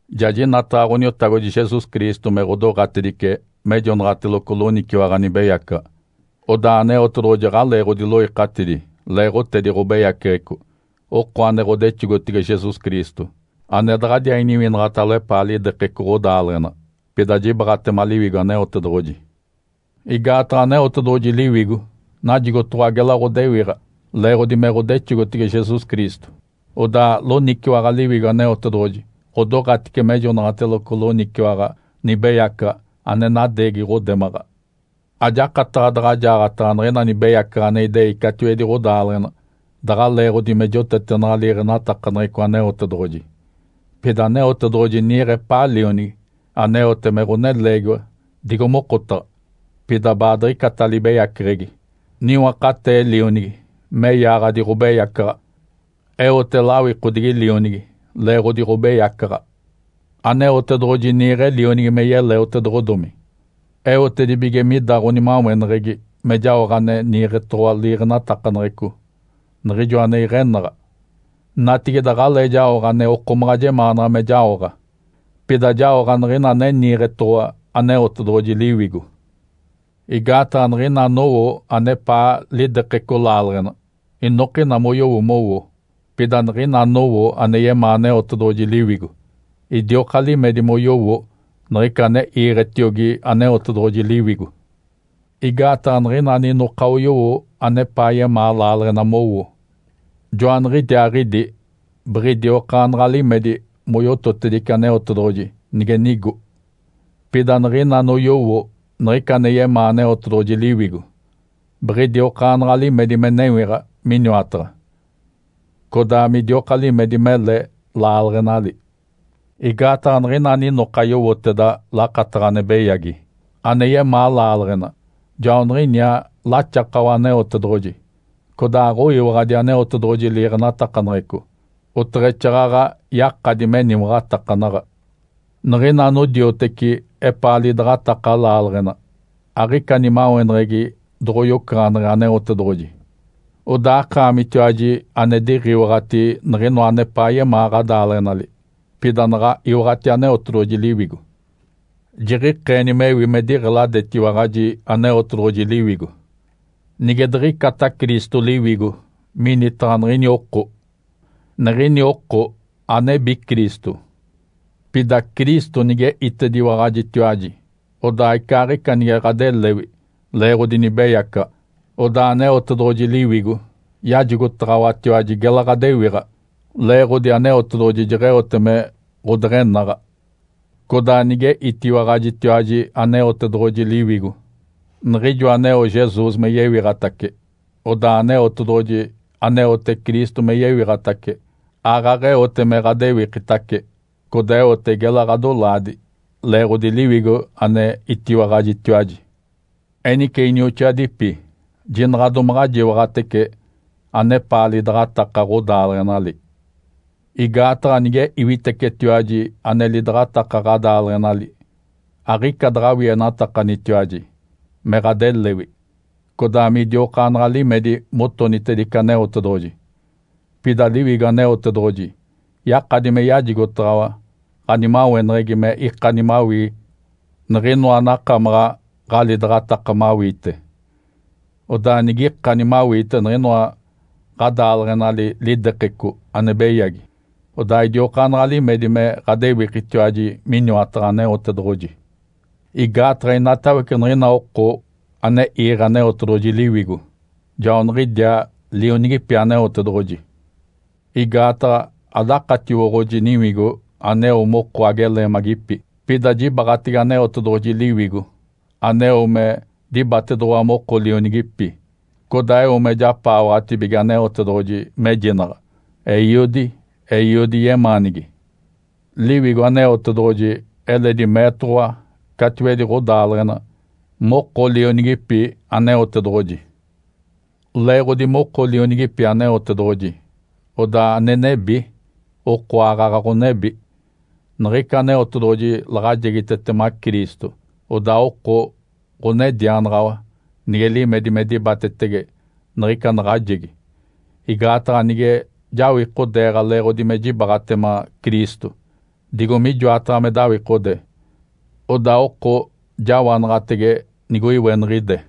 Ja jinataɡ̶a Ǥoniotagodi Jesus Cristo me ɡ̶odoɡ̶atedice mejonaɡ̶ateloco loniciwaɡ̶a nibeyacaɡ̶a, odaa Aneotedoɡ̶oji aɡ̶alee ɡ̶odiloikatidi leeɡ̶otedi ɡ̶obeyaceɡ̶eco, oko ane ɡ̶odexogotege Jesus Cristo, ane daɡ̶adiaa iniwinaɡ̶atalo epaa lidekeco ɡ̶odaaleɡ̶ena, pida jibaaɡ̶atema Liwigo Aneotedoɡ̶oji. Igaataɡ̶a Aneotedoɡ̶oji Liwigo najigotoɡ̶owa gela ɡ̶odewiɡ̶a leeɡ̶odi me ɡ̶odexogotege Jesus Cristo. Odaa loniciwaɡ̶a Liwigo Aneotedoɡ̶oji ɡ̶odoɡ̶atice mejonaɡ̶ateloco loniciwaɡ̶a nibeyacaɡ̶a ane nadeegi ɡ̶odemaɡ̶a. Ajakataɡ̶a daɡ̶a jaaɡ̶ataɡ̶a niɡ̶ina nibeyacaɡ̶a ane idei catiwedi ɡ̶odaaleɡ̶ena daɡ̶a leeɡ̶odi me jotetenaɡ̶a liiɡ̶enatakaneɡ̶eco Aneotedoɡ̶oji. Pida Aneotedoɡ̶oji niiɡ̶e epaa Lionigi aneote me ɡ̶oneleegiwa digo mokotaɡ̶a, pida baadiɡ̶icata libeyaceɡ̶egi. Niwakatee Lionigi me yaaɡ̶adi ɡ̶obeyacaɡ̶a, eote lawikodigi Lionigi leeɡ̶odi ɡ̶obeyacaɡ̶a. Aneotedoɡ̶oji niiɡ̶e Lionigi me yeleotedoɡ̶odomi, eotedibige mida ɡ̶onimaweneɡ̶egi me jaoɡ̶a ane niiɡ̶etoɡ̶owa liiɡ̶enatakaneɡ̶eco, niɡ̶ijo ane iɡ̶enaɡ̶a. Natigide aɡ̶alee jaoɡ̶a ane okomaɡ̶a jemaanaɡ̶a me jaoɡ̶a, pida jaoɡ̶a niɡ̶ina ane niiɡ̶etoɡ̶owa Aneotedoɡ̶oji Liwigo. Igaataɡ̶a niɡ̶ina anowo anepaa lidekeco laaleɡ̶ena, inokina moyowo mowo. Pida niɡ̶ina anowo ane yemaa Aneotedoɡ̶oji Liwigo, idioka limedi moyowo niɡ̶ica ane iiɡ̶etiogi Aneotedoɡ̶oji Liwigo. Igaataɡ̶a niɡ̶ina aninoka oyowo anepaa yemaa laaleɡ̶ena mowo, joaniɡ̶idiaaɡ̶idi biɡ̶idiokaanaɡ̶a limedi moyototedice Aneotedoɡ̶oji nige nigo. Pida niɡ̶ina anoyowo niɡ̶ica ane yemaa Aneotedoɡ̶oji Liwigo, biɡ̶idiokaanaɡ̶a limedi me newiɡ̶a Miniwataɡ̶a, codaa midioka limedi mele laaleɡ̶enali. Igaataɡ̶a niɡ̶ina aninoka yowoteda lakataɡ̶a ane beyagi ane yemaa laaleɡ̶ena, joaniɡ̶iniaa laxakawa Aneotedoɡ̶oji, codaa aɡ̶oyiwaɡ̶adi Aneotedoɡ̶oji liiɡ̶enatakaneɡ̶eco, oteɡ̶exaaɡ̶aɡ̶a yakadi meniwaɡ̶atakanaɡ̶a. Niɡ̶ina anodioteci epaa lidaɡ̶ataka laaleɡ̶ena, aɡ̶ica nimaweneɡ̶egi doɡ̶oyocaɡ̶aneɡ̶e Aneotedoɡ̶oji. Odaa akaamitiwaji ane diɡ̶iwaɡ̶ati niɡ̶inoa anepaa yemaa ɡ̶adaaleɡ̶enali, pida naɡ̶a iwaɡ̶ati Aneotedoɡ̶oji Liwigo, jiɡ̶ikeeni mewi me diɡ̶eladetiwaɡ̶aji Aneotedoɡ̶oji Liwigo. Nige diɡ̶icata Cristo Liwigo minitaɡ̶a niɡ̶ini oko, niɡ̶ini oko anebi Cristo. Pida Cristo nige itediwaɡ̶ajitiwaji, odaa icaaɡ̶ica nige ɡ̶adelewi leeɡ̶odi nibeyacaɡ̶a, odaa Aneotedoɡ̶oji Liwigo yajigotaɡ̶awatiwaji gela ɡ̶adewiɡ̶a leeɡ̶odi Aneotedoɡ̶oji jeɡ̶eote me ɡ̶odeɡ̶enaɡ̶a. Codaa nige itiwaɡ̶ajitiwaji Aneotedoɡ̶oji Liwigo, niɡ̶ijo aneo Jesus me yewiɡ̶atace, odaa Aneotedoɡ̶oji, aneote Cristo me yewiɡ̶atace, aaɡ̶aɡ̶eote me ɡ̶adewikitace, codaa eote gela ɡ̶adolaadi, leeɡ̶odi Liwigo ane itiwaɡ̶ajitiwaji. Enice inioxoadipi, jinaɡ̶a domaɡ̶a jiwaɡ̶atece anepaa lidaɡ̶ataka ɡ̶odaaleɡ̶enali. Igaataɡ̶a nige iwitecetiwaji ane lidaɡ̶ataka ɡ̶adaaleɡ̶enali, aɡ̶ica daɡ̶awienatakanitiwaji me ɡ̶adelewi, codaa midiokaanaɡ̶a limedi motonitedice Aneotedoɡ̶oji. Pida Liwigo Aneotedoɡ̶oji yakadi me yajigotaɡ̶awa ɡ̶animaweneɡ̶egi me ikani mawii niɡ̶inoa anakamaɡ̶a ɡ̶alidaɡ̶ataka mawiite. Odaa nigikani mawiite niɡ̶inoa ɡ̶adaaleɡ̶enali lidekeco ane beyagi, odaa idiokaanaɡ̶a limedi me ɡ̶adewikitiwaji miniwataɡ̶a Aneotedoɡ̶oji. Igaataɡ̶a inatawece niɡ̶ina oko ane iiɡ̶e Aneotedoɡ̶oji Liwigo, joaniɡ̶idiaa lionigipi Aneotedoɡ̶oji. Igaataɡ̶a adakatiwoɡ̶oji niwigo aneo moko ageleemagipi. Pida jibaɡ̶atege Aneotedoɡ̶oji Liwigo aneo me dibatedoɡ̶owa moko lionigipi, codaa eo me japaawaɡ̶atibige Aneotedoɡ̶oji mejinaɡ̶a, “Eiodi, Eiodi yemaanigi!” Liwigo Aneotedoɡ̶oji eledi meetoɡ̶owa catiwedi ɡ̶odaaleɡ̶ena moko lionigipi Aneotedoɡ̶oji. Leeɡ̶odi moko lionigipi Aneotedoɡ̶oji, odaa ane nebi, oko aaɡ̶aɡ̶a ɡ̶onebi. Niɡ̶ica Aneotedoɡ̶oji laɡ̶ajegitetema Cristo, odaa oko ɡ̶onedianaɡ̶awa nige limedi me dibatetege niɡ̶ica naɡ̶ajegi. Igaataɡ̶a nige jawikodeeɡ̶a leeɡ̶odi me jibaaɡ̶atema Cristo, digo mijoataɡ̶a me dawikode, odaa oko jawanaɡ̶atege nigoiweniɡ̶ide.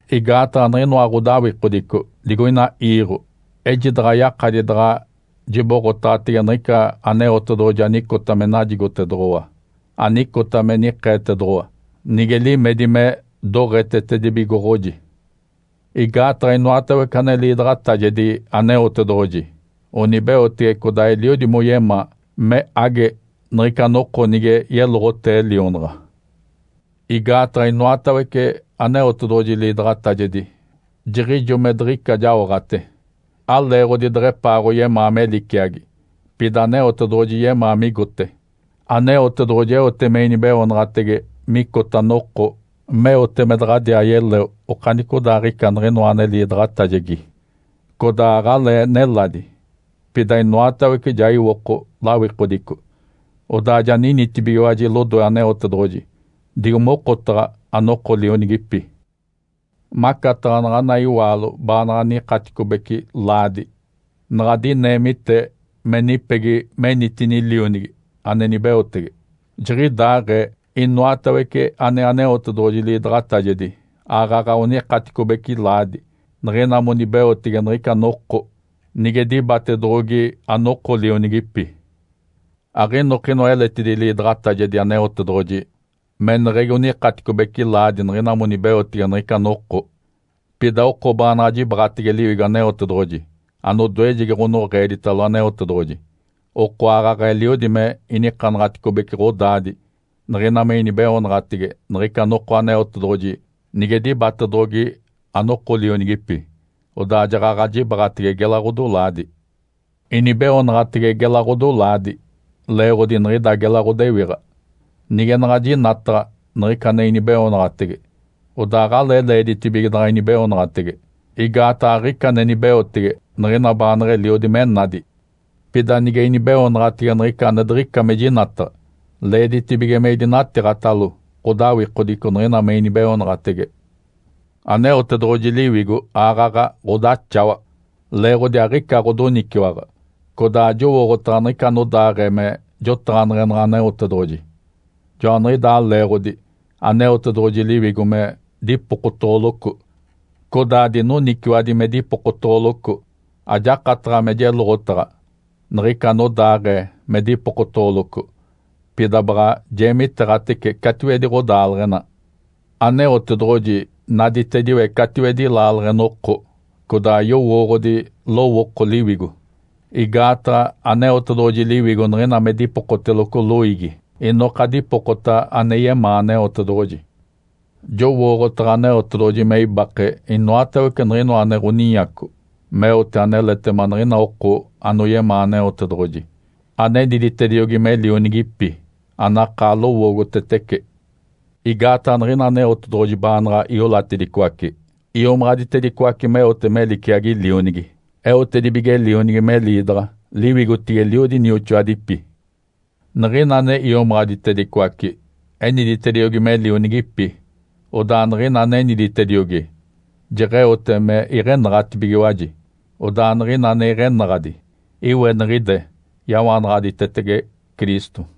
Igaataɡ̶a niɡ̶inoa ɡ̶odawikodico digoina iiɡ̶o, ejidaɡ̶a yakadi daɡ̶a jiboɡ̶otaɡ̶atege niɡ̶ica Aneotedoɡ̶oji anicota me najigotedoɡ̶owa, anicota me nikeetedoɡ̶owa, nige limedi me doɡ̶etetedibigoɡ̶oji. Igaataɡ̶a inoatawece ane liidaɡ̶atajedi Aneotedoɡ̶oji onibeotege codaa eliodi moyemaa me age niɡ̶ica noko nige yeloɡ̶otee lionaɡ̶a. Igaataɡ̶a inoatawece Aneotedoɡ̶oji liidaɡ̶atajedi jiɡ̶ijo me diɡ̶ica jaoɡ̶ate. Aleeɡ̶odi deɡ̶epaaɡ̶oyemaa me liciagi, pida Aneotedoɡ̶oji yemaa migote. Aneotedoɡ̶oji eote me inibeoonaɡ̶atege micota noko meote me daɡ̶adiaa yeleo okanicodaaɡ̶ica niɡ̶inoa ane liidaɡ̶atajegi. Codaa aɡ̶alee neladi, pida inoatawece ja iwoko lawikodico, odaa ja ninitibigiwaji lodoe Aneotedoɡ̶oji, digo mokotaɡ̶a anoko lionigipi. Macataɡ̶a naɡ̶ana iwaalo baanaɡ̶a nikaticobece laadi naɡ̶a dineemite me nipegi menitini lionigi ane nibeotege. Jiɡ̶idaaɡ̶ee, inoatawece ane Aneotedoɡ̶oji liidaɡ̶atajedi aaɡ̶aɡ̶a onikaticobece laadi niɡ̶ina monibeotege niɡ̶ica noko nige dibatedoɡ̶ogi anoko lionigipi. Aɡ̶inokinoa eletidi liidaɡ̶atajedi Aneotedoɡ̶oji meneɡ̶egi onikaticobece laadi niɡ̶ina monibeotege niɡ̶ica noko. Pida oko baanaɡ̶a jibaɡ̶atege Liwigo Aneotedoɡ̶oji, anodoejegi ɡ̶onoɡ̶eeditalo Aneotedoɡ̶oji, oko aaɡ̶aɡ̶a eliodi me inikanaɡ̶aticobece ɡ̶odaadi niɡ̶ina me inibeoonaɡ̶atege niɡ̶ica noko Aneotedoɡ̶oji nige dibatedoɡ̶ogi anoko lionigipi, odaa jaɡ̶aɡ̶a jibaɡ̶atege gela ɡ̶odolaadi. Inibeoonaɡ̶atege gela ɡ̶odolaadi leeɡ̶odi niɡ̶ida gela ɡ̶odewiɡ̶a. Nige naɡ̶a jinataɡ̶a niɡ̶ica ane inibeoonaɡ̶atege, odaa aɡ̶alee leeditibige daɡ̶a inibeoonaɡ̶atege, igaataɡ̶a aɡ̶ica ane nibeotege niɡ̶ina baanaɡ̶a eliodi me nadi. Pida nige inibeoonaɡ̶atege niɡ̶ica ane diɡ̶ica me jinataɡ̶a, leeditibige me idinatiiɡ̶atalo ɡ̶odawikodico niɡ̶ina me inibeoonaɡ̶atege. Aneotedoɡ̶oji Liwigo aaɡ̶aɡ̶a ɡ̶odaxawa, leeɡ̶odi aɡ̶ica ɡ̶odoniciwaɡ̶a. Codaa ajowooɡ̶otaɡ̶a niɡ̶ica anodaaɡ̶ee me jotaɡ̶aneɡ̶enaɡ̶a Aneotedoɡ̶oji. Joaniɡ̶idaa leeɡ̶odi Aneotedoɡ̶oji Liwigo me dipokotoɡ̶oloco. Codaa dinoniciwaɡ̶adi me dipokotoɡ̶oloco, ajakataɡ̶a me jeloɡ̶otaɡ̶a niɡ̶ica anodaaɡ̶ee me dipokotoɡ̶oloco, pida baɡ̶a jeemiteeɡ̶atece catiwedi ɡ̶odaaleɡ̶ena. Aneotedoɡ̶oji naditediwece catiwedi laaleɡ̶ena oko, codaa yowooɡ̶odi lowooko Liwigo. Igaataɡ̶a Aneotedoɡ̶oji Liwigo niɡ̶ina me dipokoteloco loiigi, inoka dipokota ane yemaa Aneotedoɡ̶oji. Jowooɡ̶otaɡ̶a Aneotedoɡ̶oji me ibake inoatawece niɡ̶inoa ane ɡ̶oninyaco meote aneletema niɡ̶ina oko anoyemaa Aneotedoɡ̶oji, aneniditediogi me lionigipi, anakaa lowoogotetece. Igaataɡ̶a niɡ̶ina Aneotedoɡ̶oji baanaɡ̶a iolatedicoace, iomaɡ̶aditedicoace meote me liciagi Lionigi. Eotedibige Lionigi me liidaɡ̶a liwigotigilo eliodi nioxoadipi. Niɡ̶ina ane iomaɡ̶aditedicoace, eniditediogi me lionigipi. Odaa niɡ̶ina aneniditediogi, jeɡ̶eote me iɡ̶enaɡ̶atibigiwaji. Odaa niɡ̶ina ane iɡ̶enaɡ̶adi, iweniɡ̶ide yawanaɡ̶aditetege Cristo.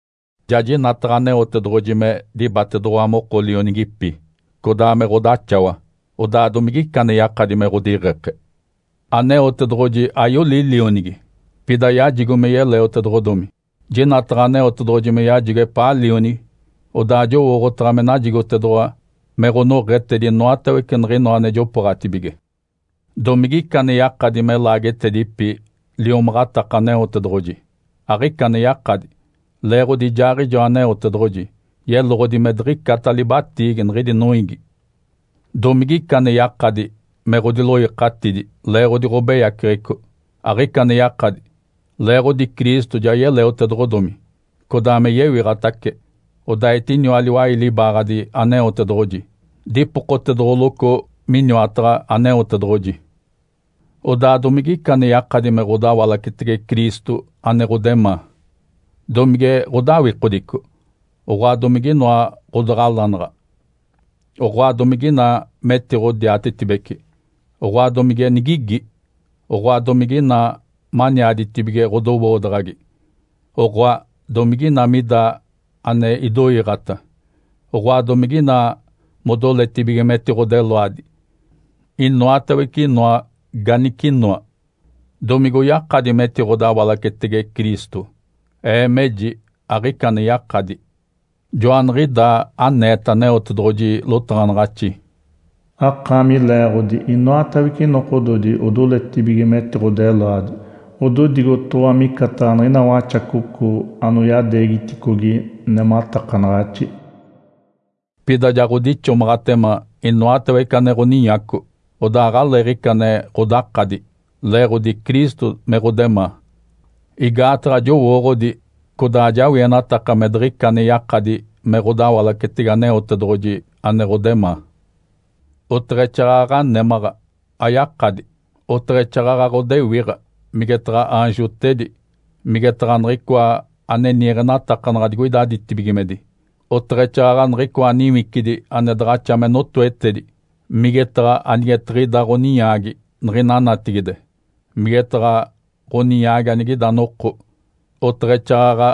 Ja jinataɡ̶a Aneotedoɡ̶oji me dibatedoɡ̶owa moko lionigipi, codaa me ɡ̶odaxawa, odaa domigica ane yakadi me ɡ̶odiɡ̶eke? Aneotedoɡ̶oji ayoli Lionigi, pida yajigo me yeleotedoɡ̶odomi. Jinataɡ̶a Aneotedoɡ̶oji me yajigo epaa Lionigi, odaa jowooɡ̶otaɡ̶a me najigotedoɡ̶owa me ɡ̶onoɡ̶etedi inoatawece niɡ̶inoa ane jopooɡ̶atibige. Domigica ane yakadi me laagetedipi liomaɡ̶ataka Aneotedoɡ̶oji? Aɡ̶ica ane yakadi. Leeɡ̶odi ijaaɡ̶ijoa Aneotedoɡ̶oji yeloɡ̶odi me diɡ̶icata libatiigi niɡ̶idi noiigi. Domigica ane yakadi me ɡ̶odiloikatidi leeɡ̶odi ɡ̶obeyaceɡ̶eco? Aɡ̶ica ane yakadi, leeɡ̶odi Cristo ja yeleotedoɡ̶odomi, codaa me yewiɡ̶atace, odaa etiniwa liwai libaaɡ̶adi Aneotedoɡ̶oji, dipokotedoɡ̶oloco miniwataɡ̶a Aneotedoɡ̶oji. Odaa, domigica ane yakadi me ɡ̶odawalacetege Cristo ane ɡ̶odemaa? Domige ɡ̶odawikodico, oɡ̶oa domige inoa ɡ̶odaɡ̶alanaɡ̶a, oɡ̶oa domige ina metiɡ̶odiatetibeci, oɡ̶oa domige nigigi, oɡ̶oa domige ina maniaditibige ɡ̶odowoodaɡ̶agi, oɡ̶oa domige ina mida ane idoiiɡ̶ata, oɡ̶oa domige ina modoletibige metiɡ̶odeloadi; inoatawece inoa ganicinoa, domigoyakadi metiɡ̶odawalacetege Cristo? Ee meji aɡ̶ica ane yakadi. Joaniɡ̶idaa aneeta Aneotedoɡ̶oji lotaɡ̶anaɡ̶axi, “Akaami leeɡ̶odi, inoatawece nokododi odoletibige metiɡ̶odeloadi. Ododigotoɡ̶owa micataɡ̶a niɡ̶ina waxacoco anoyadeegiticogi nematakanaɡ̶axi.” Pida ja ɡ̶odixomaɡ̶atema inoatawece ane ɡ̶oninyaco, odaa aɡ̶aleeɡ̶ica ane ɡ̶odakadi, leeɡ̶odi Cristo me ɡ̶odemaa. Igaataɡ̶a jowooɡ̶odi, codaa ajawienataka me diɡ̶ica ane yakadi me ɡ̶odawalacetege Aneotedoɡ̶oji ane ɡ̶odemaa. Oteɡ̶exaaɡ̶aɡ̶a némaɡ̶a ayakadi, oteɡ̶exaaɡ̶aɡ̶a ɡ̶odewiɡ̶a, migetaɡ̶a aanjotedi, migetaɡ̶a niɡ̶icoa ane niiɡ̶enatakanaɡ̶a digoida ditibigimedi, oteɡ̶exaaɡ̶aɡ̶a niɡ̶icoa niwicidi ane daɡ̶axa me notoetedi, migetaɡ̶a anigetiɡ̶ida ɡ̶oninyaagi niɡ̶ina natigide, migetaɡ̶a ɡ̶oninyaagi anigida noko, oteɡ̶exaaɡ̶aɡ̶a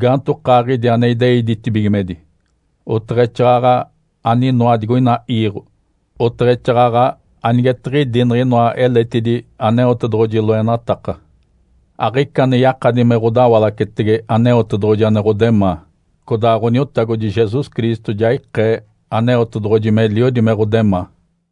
gaantokaaɡ̶idi ane idei ditibigimedi, oteɡ̶exaaɡ̶aɡ̶a aninoa digoina iiɡ̶o, oteɡ̶exaaɡ̶aɡ̶a anigetiɡ̶idi niɡ̶inoa eletidi Aneotedoɡ̶oji loenataka. Aɡ̶ica ane yakadi me ɡ̶odawalacetege Aneotedoɡ̶oji ane ɡ̶odemaa. Codaa Ǥoniotagodi Jesus Cristo ja ikee Aneotedoɡ̶oji meliodi me ɡ̶odemaa.